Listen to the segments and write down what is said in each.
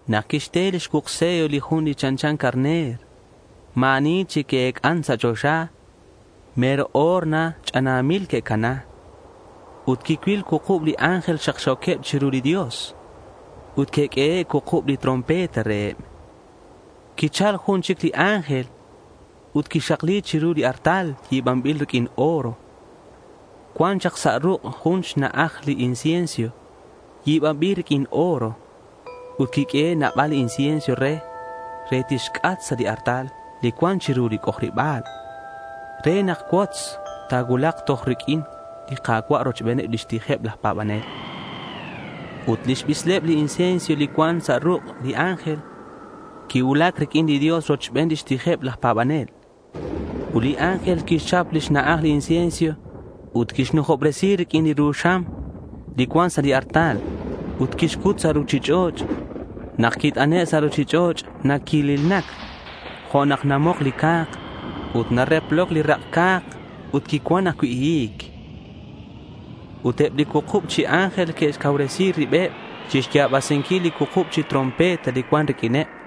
Nak quixte li xcuuk sello li Jun li chanchan carner, ma̱ ani chic qui-ec'an sa' choxa. Mero o̱r na ch'anamil que'cana. Ut quicuil cuukub li ángel xakxo̱queb chiru li Dios. Ut que'q'uehe' cuukub li trompeta reheb. Quichal jun chic li ángel ut quixakli chiru li artal yi̱banbil riq'uin oro. Cuan chak sa' ruk' jun xna'aj li incienso yi̱banbil riq'uin oro. Quiq'uehe' nabal li incienso re, re tixc'at sa' li artal li cuan chiru li c'ojariba̱l, re nak cuotz ta̱cuulak toj riq'uin li Ka̱cua' rochben lix tijeb laj pa̱banel. Ut lix sibel li incienso li cuan sa' ruk' li ángel quicuulac riq'uin li Dios rochben lix tijeb laj pa̱banel. Ut li ángel quixchap li xna'aj li incienso ut quixnujobresi riq'uin li ru xam li cuan sa' li artal, ut quixcut sa' ruchich'och'. Nak quit'ane' sa' ruchich'och' naquililnac jo' nak namok li ca̱k, ut nareploc li rak' ca̱k ut quicuan ajcui' hi̱c. Ut eb li cuukub chi ángel que'xcauresi ribeb chixya̱basinquil li cuukub chi trompeta li cuan riq'uineb.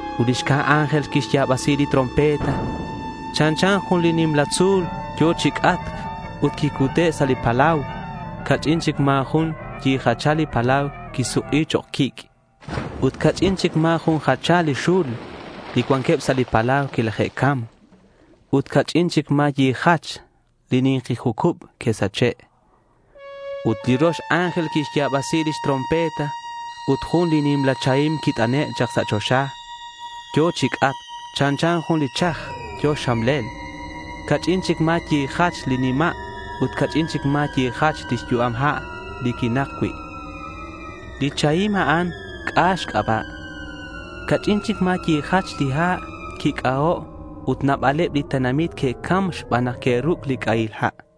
Ut li xcab ángel quixya̱basi lix trompeta. Chanchan jun li nimla tzu̱l yo̱ chi c'atc ut quicute' sa' li palau. Ca'ch'in chic ma̱ jun jachal li palau quisuk'i chok' quic'. Ut ca'ch'in chic ma̱ jun jachal li xul li cuanqueb sa' li palau quilaje'cam. Ut ca'ch'in chic ma̱ yijach li ni̱nki jucub que'sache'. Ut li rox ángel quixya̱basi lix trompeta ut jun nimla chahim quit'ane' chak sa' choxa. Yo̱ chi c'atc. Chanchan jun li chaj yo̱ xxamlel. Ca'ch'in chic ma̱ yijach li nima' ut ca'ch'in chic ma̱ yijach li yu'am ha' li quinak cui'. Li chahim a'an, C'a xc'aba'. Ca'ch'in chic ma̱ yijach li ha' quic'aho' ut nabaleb li tenamit que'cam xban nak que'ruc' li c'ahil ha'.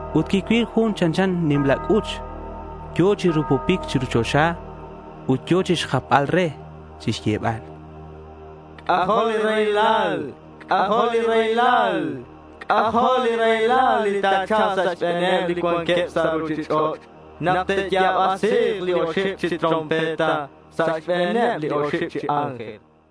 Ut quicuil jun chanchan nimla c'uch yo̱ chi rupupic chiru choxa, ut yo̱ chixjapbal re chixyebal: —C'ajo' li raylal, c'ajo' li raylal. C'ajo' li raylal li ta̱cha̱lk sa' xbe̱neb li cuanqueb sa' ruchich'och' nak te'ya̱basi̱k li oxib chic chi trompeta xbaneb li oxib chi ángel, chan.